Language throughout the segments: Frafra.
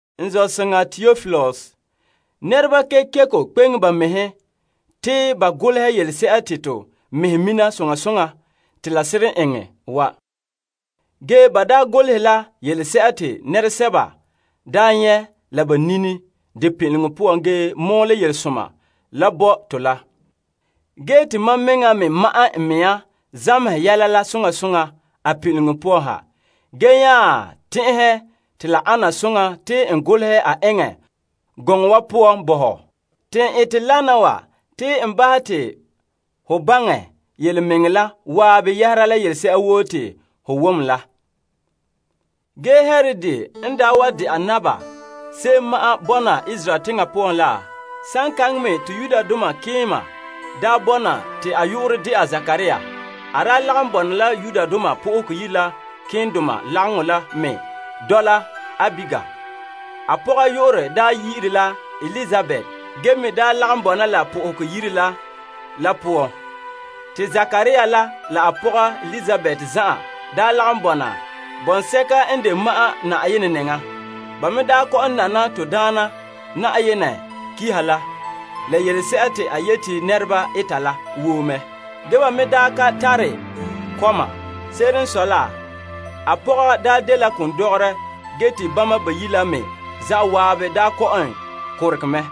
N zɔ'soŋa Teopilus, nɛreba kekeko kpeŋe ba mɛhe te ba golehɛ yelese'a te to mɛhe mina soŋa soŋa te la seren eŋɛ wa. Ge ba daa golehɛ la yelese'a te nɛresɛba daa nyɛ' la ba nini de pin'ileŋɔ poan ge mɔɔlɛ Yelesoma la bo to la. Ge te mam mɛŋa me ma'ɛn n mea zamehɛ yɛla la soŋa soŋa a pin'ileŋɔ poan ha, ge nya tɛn'ɛhɛ te la ana soŋa te n golehɛ a eŋɛ gɔŋɔ poan bo ho. Te n ete wana wa te n bahɛ te ho baŋɛ yelemɛŋɛrɛ la zan'an yɛhera yelese'a woo te ho wom la. Ge Herod n daa wa de'a Naba se'em ma'an bɔna Yudea teŋa poan la, saŋkaŋa me te malemadaana daa bɔna te a yu'urɛ de'a Zekaria. A lagom bɔna la malema keendoma lagaŋɔ la mɛ dɔla Abiya. A pɔga yu'urɛ yi'ire la Elizabet ze'ele Aron buuri la poan na. Te Zekaria la a pɔga Elizabet zan'an daa lagom bɔna bɔŋsɛka n de ma'an Na'ayenɛ nɛŋa. Ba me kɔ'ɔn nana to Daana Na'ayenɛ Pa'alegɔ la, la yelese'a te a yete nɛreba ete la woo mɛ. Ge ba me ka tare kɔma. Se'ere n sɔe la, a pɔga dela kondɔgɔrɛ ge te bama bayi' la me zan'an kɔ'ɔn korogɛ mɛ.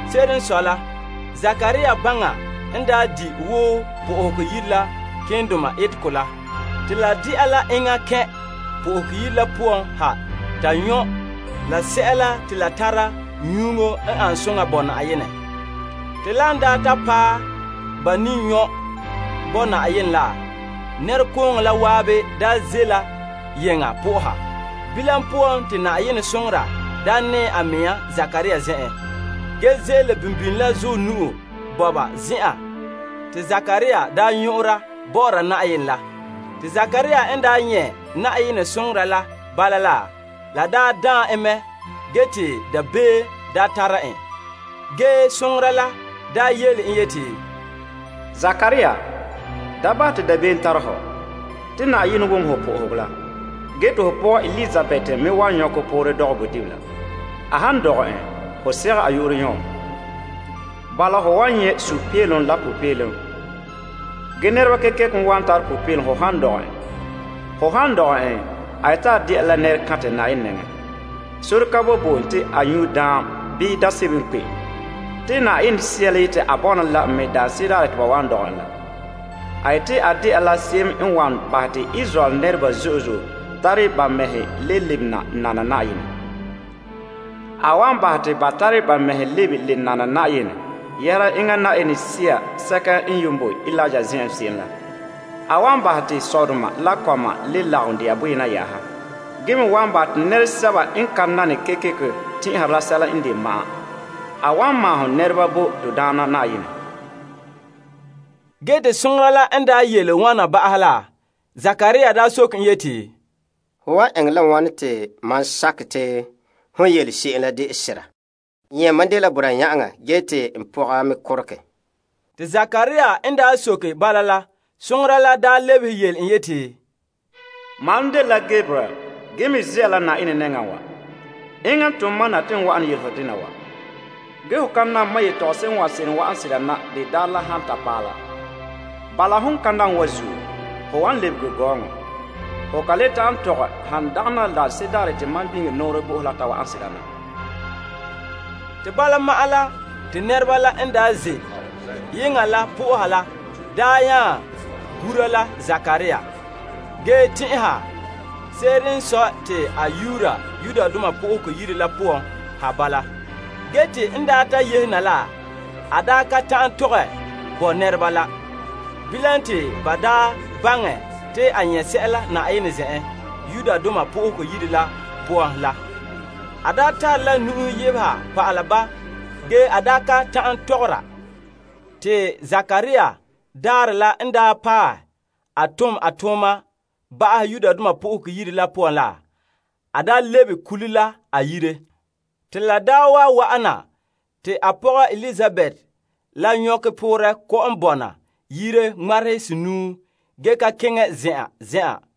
Se'ere n sɔe la, Zekaria gbaŋa n di' wo Yenɛ Yire la malemadoma etegɔ la. Te la de'a la enŋa kɛn' Yenɛ Yire la poan ha ta nyɔ' sɛla te la tara nyuŋo ane soŋa bo Na'ayenɛ. Te lan ta paɛ ba ne nyɔ' bo Na'ayenɛ la, nɛrekooŋɔ la zan'an ze' la yeŋa soha Yenɛ. Bilam poan, te Na'ayenɛ soŋora nɛɛ a mea Zekaria zen'en, ge ze'ele ko'ɛnka daka la zuɔ nu'o bɔba zen'an te Zekaria nyɔ'ɔra bɔ'ɔra Na'ayenɛ la. Te Zekaria n nyɛ' Na'ayenɛ soŋora la bala la, la daan en mɛ ge te dabeem tara en. Ge soŋora la yele en yeti, Zekaria, da bahɛ te dabeem tara hɔ. Te Na'ayenɛ wom ho sohoga la ge te ho pɔga Elizabet la me wan nyɔkɛ poorɛ dɔgɛ bodibila. A han dɔgɛ en, ho sigɛ a yu'urɛ Yon. Bala, ho wan nyɛ' sunpeelom la popeelom ge nɛreba kekeko wan tara popeelom ho han dɔgɛ en. A yeti a dɛna la nɛrekantɛ Na'ayenɛ nɛŋan. Sore ka boe bo en te a nyu' daam bii daam sebo n kpe'em. Te Yenɛ Sea la yete a bɔna la en mɛ daanse'ere daarɛ te ba wan dɔgɛ en la. A yeti a dɛna la se'em n wan bahɛ te Israel nɛreba zo'e zo'e tare ba mɛhe le lebena nana Na'ayenɛ. A wan bahɛ te ba tara ba mɛhe lebe le nana Na'ayenɛ yɛhera enŋa Yenɛ Sea sɛka n boe Eliya zen'en se'em la. A wan bahɛ te sɔdoma la kɔma le lagom dɛna boyena yɛ'ɛha ge me wan bahɛ te nɛresɛba n ka nane, tɛn'ɛha la sɛla n de ma'an. A wan maahom nɛreba bo to Daana Na'ayenɛ. Te Zekaria soke en yeti, Hom n wan eŋɛ la wane te mam sakɛ te hon yele mam se'em wa dela sera? Nyɛ' mam dela boraa yan'aŋa ge te n pɔga me korogɛ. Te Zekaria n soke bala la, soŋora la lebehe yele en yeti, Mam dela Gabriel ge me ze'a la Na'ayenɛ nɛŋa wa. Enŋa n tom mam na te n wa'ana yele ho dena wa. Ho ka nam mam yetɔgom sebo n wan seren wa'an sera na de daarɛ la han paɛ la. Bala, hon ka nam wa zuo, ho wan lɛbege gɔɔŋɔ. Ho kan le ta'an tɔgɛ han dagana la daanse'ere daarɛ te mam biŋe n nɔɔrɛ bo ho la ta wa'an sera na. Te bala ma'an la, te nɛreba la n daa ze' yeŋa la soha Yenɛ la nya gura la Zekaria, ge tɛn'ɛha se'ere n sɔe te a yuura Yenɛ Yire la poan ha bala. Ge te n ta yehe na la, a ka ta'an tɔgɛ bo nɛreba la. Bilam, te ba baŋɛ te a nyɛ' sɛla Yenɛ Yire la poan la. A tare la nu'uhe yebeha pa'ala ba ge a ka ta'an tɔgɔra. Te Zekaria daarɛ la n paɛ a tom a tooma ba'ahɛ la, a lebe kule la a yire. La daa wa wa'an na te a pɔga Elizabet la nyɔkɛ poorɛ kɔ'ɔn bɔna yire ŋmarehe senuu ge ka keŋɛ zen'an zen'an,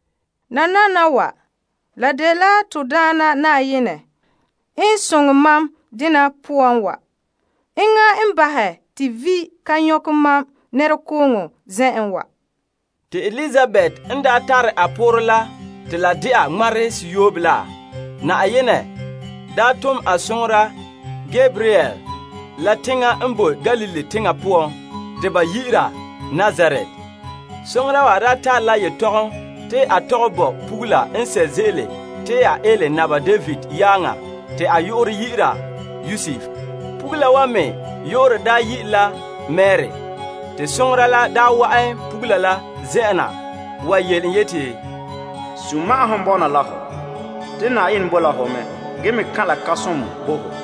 Nananawa, la dela to Daana Na'ayenɛ n soŋɛ mam dena poan wa. Enŋa n bahɛ te vi' ka nyɔkɛ mam nɛreba zen'an wa. Te Elizabet n daa tara a poorɛ la te la de'a ŋmarehe seyoobe la, Na'ayenɛ daa a soŋora Gabriel la teŋa n boe Galilee teŋa poan te a yu'urɛ dɛna Nazaret. Soŋora wa tare la yetɔgom te a tɔgɛ bo pɔgɔsa'a kanhere n ele Naba David yaaŋa te a yu'urɛ dɛna Yosef. Pugula wa me yu'urɛ dɛna Mari. Te soŋora la wa'an pugula la zen'en wa yele en yeti, Sunma'ahom bɔna la hɔ. Te Na'ayenɛ boe la ho mɛ ge me kan' la kan'somɔ bo ho.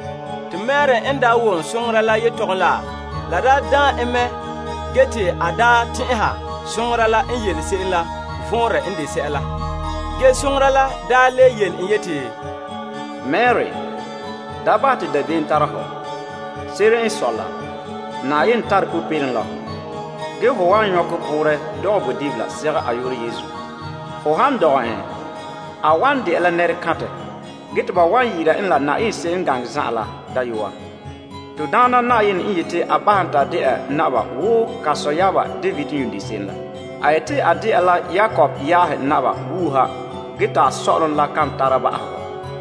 Te Mari n wom soŋora la yetɔgom la, la daan en mɛ ge te a daa tɛn'ɛha soŋora la n yele se'em la vɔnrɛ n de sɛla. Ge soŋora la le yele en yeti, Mari, da bahɛ te dabeem tara hɔ. Se'ere n sɔe la, Na'ayenɛ tare popeelom la hɔ. Ge ho wan nyɔkɛ poorɛ dɔgɛ bodibila segɛ a yu'urɛ Yesu. Ho han dɔgɛ en, a wan de'a la nɛrekantɛ ge te ba wan yi'ire en la Na'ayenɛ Se'em N Gane Zan'an la Dayɔa. To Daana Na'ayenɛ n yeti a bahɛ en te de'a naba wo a sɔyaaba David yuun de se'em la. A yeti a de'a la Yakob yaahe naba wuuha ge ta a sɔ'ɔlom la kan tare ba'ahegɔ.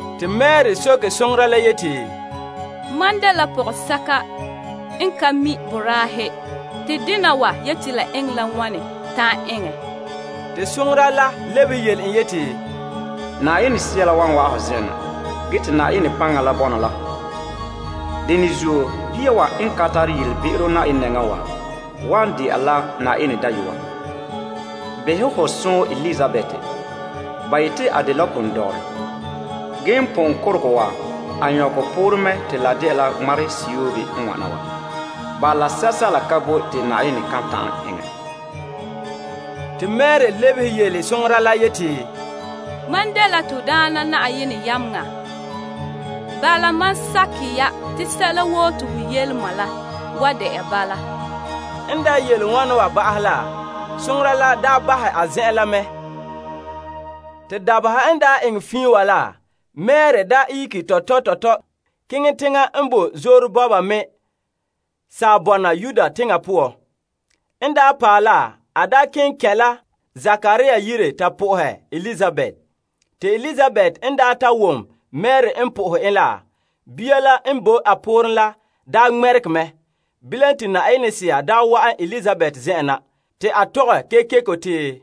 Te Mari soke soŋora la yeti, Mam dela pɔgɔsɛka n nan ka tabelɛ mina boraahe, te dena wa yeti la eŋɛ la wane ta'an eŋɛ? Te soŋora la lebehe yele en yeti, Yenɛ Sea la wan wa'an ho zen'en na ge te Na'ayenɛ paŋa la bɔna la hɔ. Dene zuo, fa'a bia wa, wan dɛna Na'ayenɛ Dayɔa. Behɛ ho sɔɔn Elizabet. Ba yete a dela kondɔgɔrɛ, ge n pon korogɛ wa, a nyɔkɛ poorɛ mɛ te la de'a la ŋmarehe seyoobe n wana wa. Bala, sɛla ka boe te Na'ayenɛ kan ta'an eŋɛ. Te Mari lebehe yele soŋora la yeti, Mam dela to Daana Na'ayenɛ yameŋa. Bala, ma sakɛ ya te sɛla woo te ho yele ma la wan de'a bala. N daa yele wana wa ba'ahɛ la, soŋora la daa bahɛ a zen'en mɛ. Te dabeha n daa eŋɛ fiin wa la, Mari daa ihege tɔtɔ tɔtɔ keŋɛ teŋa n bo zoore bɔba bɔna Yudea teŋa poan. N paɛ la, a keŋɛ kɛn' la Zekaria yire ta po'ohɛ Elizabet. Te Elizabet n ta wom Mari n po'ohɛ en la, bia la n bo a pooren la daa ŋmɛregɛ mɛ. Bilam te Yenɛ Sea daa wa'an Elizabet zen'en na, te a tɔgɛ kekeko te,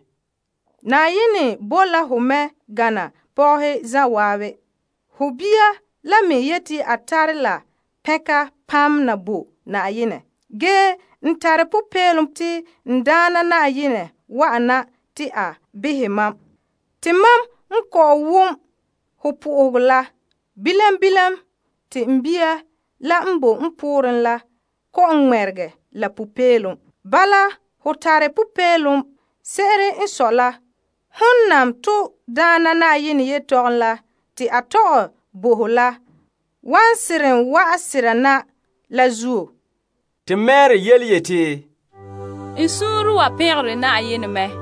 Na'ayenɛ boe la hon mɛ gana pɔgɔhe zan'an. Ho bia la me yeti a tare la pɛnka na bo Na'ayenɛ. Ge n tare popeelom te n Daana ma wa'an na te a behɛ mam. Te mam n kɔ'ɔn wom ho po'ohegɔ la, bilam bilam te n bia la n boe n pooren wa la kɔ'ɔn ŋmɛregɛ la popeelom. Bala, ho tare popeelom. Se'ere n sɔe la, hon nam to Daana Na'ayenɛ yelehom la te a tɔgɛ bo ho la wan seren wa'an sera na la zuo. Te Mari yeti, N suunre wa pɛngere Na'ayenɛ mɛ.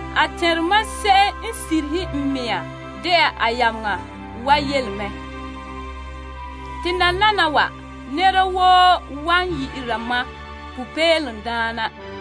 A tɛnre mam n de taroma wa n de a yameŋa wa yele mɛ. Te nananawa, nɛra woo wan yi'ira mam popeelomdaana.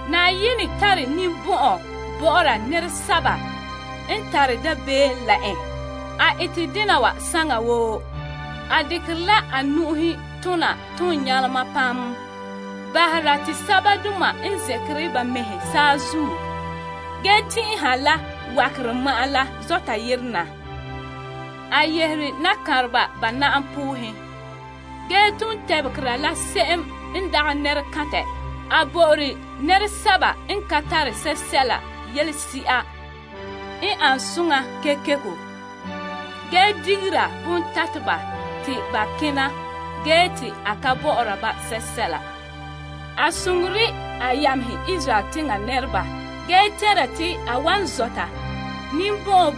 Na'ayenɛ tare ninbɔn'ɔn bɔ'ɔra nɛresɛba n tare dabeem la en. A ete dena wa saŋa woo. A dekere la a nu'uhen tona toon nyalema, bahera te sɛbadoma n zɛnkere ba mɛhe saazuo ge tɛn'ɛha la wakerɛ ma'an la zɔ' yerom. A yehere nakanreba ba na'am poohen, ge ton tebegera la se'em n dagɛ nɛrekantɛ. A bo'ore nɛresɛba n ka tara sɛla yelese'a n ane soŋa kekeko. Ge digera bontateba te ba kena ge te a ka bɔ'ɔra ba sɛla. A soŋore a yamehe Israel teŋa nɛreba ge tɛnra te a wan zɔta ninbɔn'ɔn,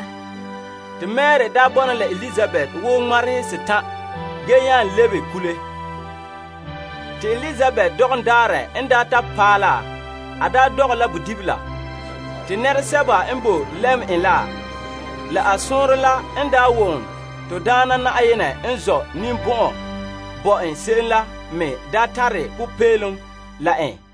Ge te Mari daa bɔna la Elizabet wo ŋmarehe setan' ge nya lebe kule. Te Elizabet dɔgɔm daarɛ n daa ta paɛ la, a dɔgɛ la bodibila. Te nɛresɛba n boe lɛm en la, la a sɔɔnrɔ la n wom to Daana Na'ayenɛ n zɔ' ninbɔn'ɔn bo en se'em la me tare popeelom la en.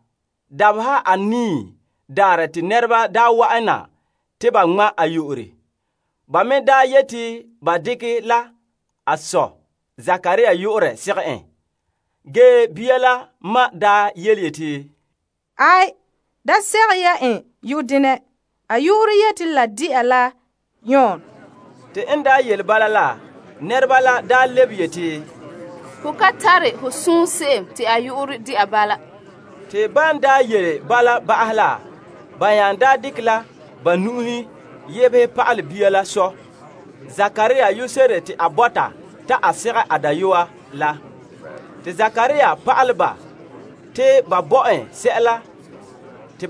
Dabeha anii daarɛ te nɛreba daa wa'an na te ba ŋma' en. Ba me daa yeti ba dekɛ la a sɔ Zekaria yu'urɛ segɛ en. Ge bia la ma yeti, Aai, da sigɛ ya en yu'urɛ denɛ. A yu'urɛ yeti la de'a la Yon. Te n daa yele bala la, nɛreba la daa lebehe yeti, Ge ho ka tare ho sɔɔn se'em te a yu'urɛ de'a bala. Te ban daa yele bala ba'ahɛ la, ba nya dekɛ la nu'uhen yebehɛ pa'alɛ bia la sɔ Zekaria yu'urɛ se'ere te a bɔta ta a segɛ a dayɔa la. Te Zekaria pa'alɛ ba te ba bo en sɛla te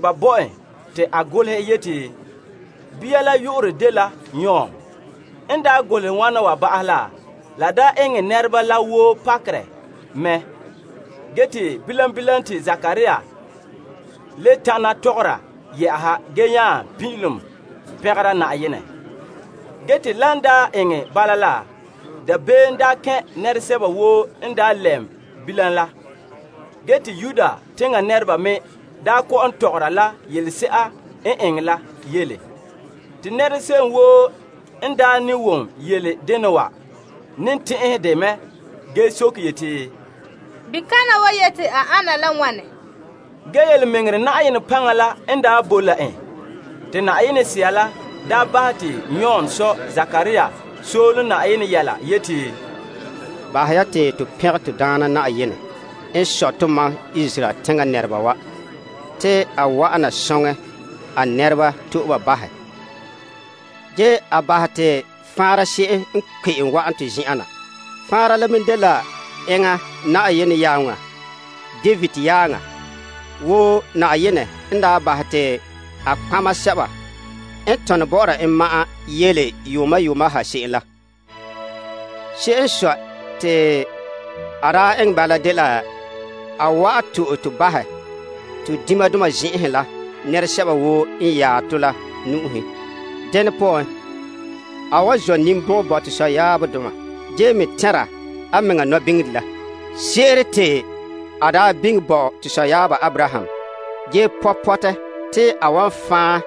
a golehɛ yeti, Bia la yu'urɛ dela Yon. N golehɛ wana wa ba'ahɛ la, la daa eŋɛ nɛreba la woo pakerɛ mɛ. Ge te bilam bilam te Zekaria le tana tɔgɔra te la yɛ'ɛha ge nya pin'ilom pɛngera Na'ayenɛ. Ge te lan eŋɛ bala la, dabeem daa kɛn' nɛresɛba woo n daa lɛm bilam la. Ge te Yudea teŋa nɛreba me kɔ'ɔn tɔgɔra la yelese'a n eŋɛ la yele. Te nɛra se'em woo n ne wom yele dena wa, ne tɛn'ɛn dɛ mɛ ge soke yeti, Bikana wa yeti a ana la wane? Ge yelemɛŋɛrɛ Na'ayenɛ paŋa la n bo la en. Te Yenɛ Sea la daa bahɛ te Yon sɔ Zekaria soolom Na'ayenɛ yɛla yeti, Bahɛ ya te to pɛngɛ to Daana Na'ayenɛ n sɔe tomam Israel teŋa nɛreba wa. Te a wa'an na soŋɛ a nɛreba to'e ba bahɛ. Ge a bahɛ te faanra se'em n kpe'em wa'an to zen'en na. Faanra la me dela enŋa Na'ayenɛ yameŋa David yaaŋa. Wo Na'ayenɛ n bahɛ te a toolom nɔtɔgɔheba sɛba n tone bɔ'ɔra en, yele yuuma yuuma ha se'em la. Se'ere n sɔe, te a eŋɛ bala daa dela a wan to'e to bahɛ to diŋdoma zen'enhe la nɛresɛba woo n yaɛ tɔ la nu'uhe. Dene poan, a wan zɔ' ninbɔn'ɔn bo to sɔyaabdoma ge me tɛn'ɛra a mɛŋa toolom nɔbiŋere la. Se'ere te a biŋe bo to sɔyaaba Abraham, ge pɔ' pɔtɛ te a wan fan'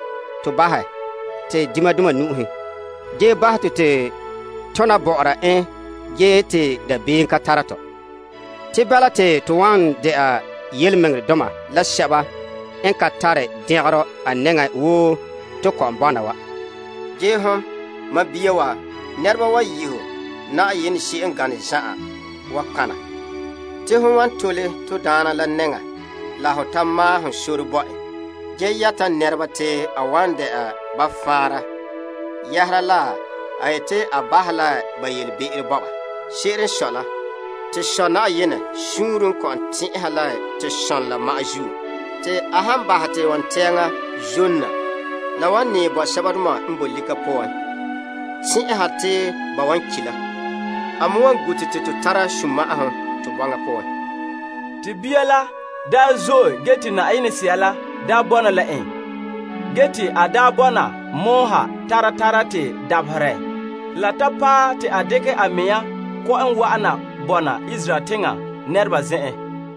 tɔ bahɛ te diŋdoma nu'uhen. Ge bahɛ te to tona bɔ'ɔra en ge te dabeem kan tara tɔ. Te bala te to wan dɛna tontɔɔdoma la toolom doma a nɛŋan wo to kɔ'ɔn bɔna wa. Ge hon, mam bia wa, nɛreba wan yi' ho Na'ayenɛ se'em n gane zan'an wa nɔtɔgɔha. Te hon wan tole to Daana la nɛŋan la ho ta maahom sore bo en. Ge yɛta a nɛreba te a wan dɛna ba faanra yɛhera la en yeti a bahɛ la ba yelebe'ero bo ba. Se'ere n sɔe la, te Sɔ' Na'ayenɛ suunre n kɔ'ɔn tɛn'ɛha la to som ma'an la zuo. Te a han bahɛ te wontɛɛŋa zom na, la wan nɛɛ bo sɛbadoma n boe lika poan, tɛn'ɛha te ba wan ki' la. A me wan gu' to te to tara sunma'ahom to bɔŋa poan. Te bia la daa zo'e ge te Yenɛ Sea la daa bɔna la en. Ge te a bɔna pɔgɔtia ha tara tara te dabaherɛ la ta paɛ te a dekɛ a mea kɔ'ɔn wa'ana bɔna Israel teŋa nɛreba zen'an.